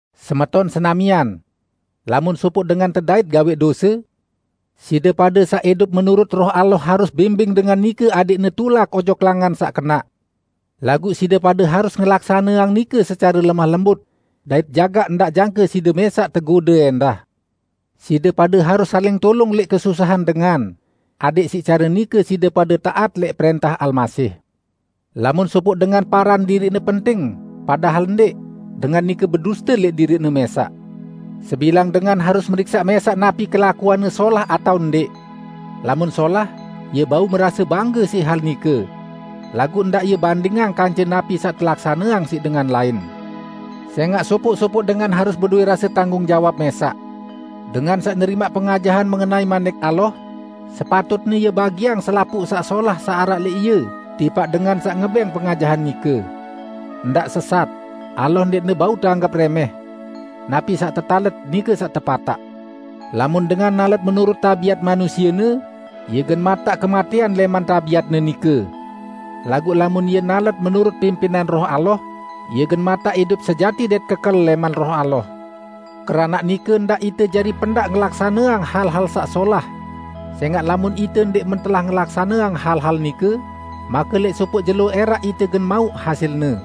Semeton senamian! Lamun sopoq dengan tedait gawẽq dose, side pade saq idup menurut Roh Allah harus bimbing dengan nike adẽqne tulak ojok langan saq kenaq. Laguq side pade harus ngelaksaneang nike secare lemah lembut, dait jagaq ndaq jangke side mẽsaq tegode ẽndah. Side pade harus saling tulung lẽq kesusahan dengan, adẽq siq care nike side pade taat lẽq prẽntah Almasih. Lamun sopoq dengan paran diriqne penting, padahal ndẽq, dengan nike beduste lẽq diriqne mẽsaq. Sebilang dengan harus meriksaq mẽsaq napi kelakuanne solah atao ndẽq. Lamun solah, ie bau merase bangge siq hal nike. Laguq ndaq ie bandingang kance napi saq telaksaneang siq dengan lain. Sẽngaq sopoq-sopoq dengan harus bedowẽ rase tanggung jawab mẽsaq. Dengan saq nerimaq pengajahan mengenai Manik Allah, sepatutne ie bagiang selapuq saq solah saq araq lẽq ie tipaq dengan saq ngebẽng pengajahan nike. Ndaq sesat. Allah ndẽqne bau teanggep rẽmẽh! Napi saq tetalet, nike saq tepataq. Lamun dengan nalet menurut tabiat manusiene, ie gen mataq kematẽan lẽman tabiatne nike. Laguq lamun ie nalet menurut pimpinan Roh Allah, ie gen mataq idup sejati dait kekel lẽman Roh Allah. Keranaq nike, ndaq ite jari pendaq ngelaksaneang hal-hal saq solah; sẽngaq lamun ite ndẽq mentelah ngelaksaneang hal-hal nike, make lẽq sopoq jelo ẽraq ite gen mauq hasilne.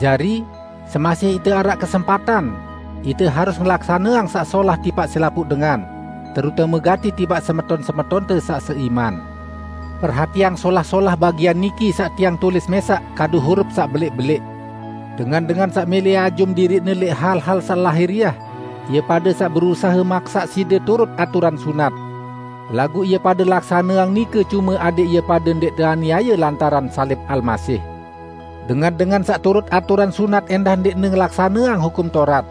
Jari, semasih ite araq kesempatan umaq, ite harus ngelaksaneang saq solah tipaq selapuq dengan, terutame gati tipaq semeton-semetonte saq seiman. Perhatiang solah-solah bagian niki saq tiang tulis mẽsaq kadu hurup saq belẽq-belẽq. Dengan-dengan saq mẽlẽ ajum diriqne lẽq hal-hal saq lahiriah, ie pade saq berusahe maksaq side turut aturan sunat. Laguq ie pade laksaneang nike cume adẽq ie pade ndẽq teaniaye lantaran salib Almasih. Dengan-dengan saq turut aturan sunat ẽndah ndẽqne ngelaksaneang Hukum Taurat.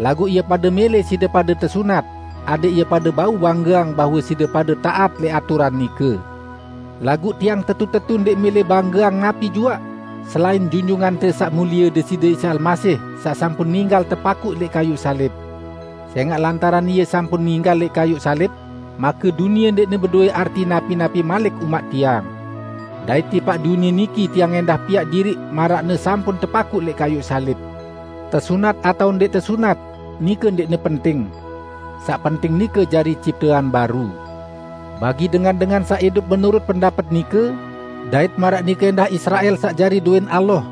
Laguq ie pade mẽlẽ side pade tesunat, adẽq ie pade bau banggeang bahwe side pade taat lẽq aturan nike. Laguq tiang tetu-tetu ndẽq mẽlẽ banggeang napi juaq, selain Junjungante Saq Mulie Deside Isa Almasih saq sampun ninggal tepakuq lẽq kayuq salib. Sẽngaq lantaran Ie sampun ninggal lẽq kayuq salib, make dunie ndẽqne bedowẽ arti napi-napi malik umaq tiang. Dait tipaq dunie niki, tiang ẽndah piaq diriq maraqne sampun tepakuq lẽq kayuq salib. Tesunat atao ndẽq tesunat, nike ndẽqne penting. Saq penting nike jari ciptean baru. Bagi dengan-dengan saq idup menurut pendapet nike, dait maraq nike ẽndah Israel saq jari dowẽn Allah,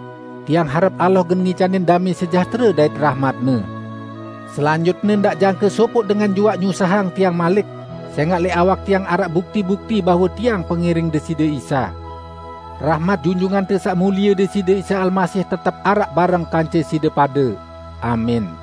tiang harep Allah gen ngicanin damẽ sejahtere dait rahmat-Ne. Selanjutne, ndaq jangke sopoq dengan juaq nyusahang tiang malik, sẽngaq lẽq awak tiang araq bukti-bukti bahwe tiang pengiring Deside Isa. Rahmat Junjungante Saq Mulie Deside Isa Almasih, tetep araq bareng kance side pade. Amin.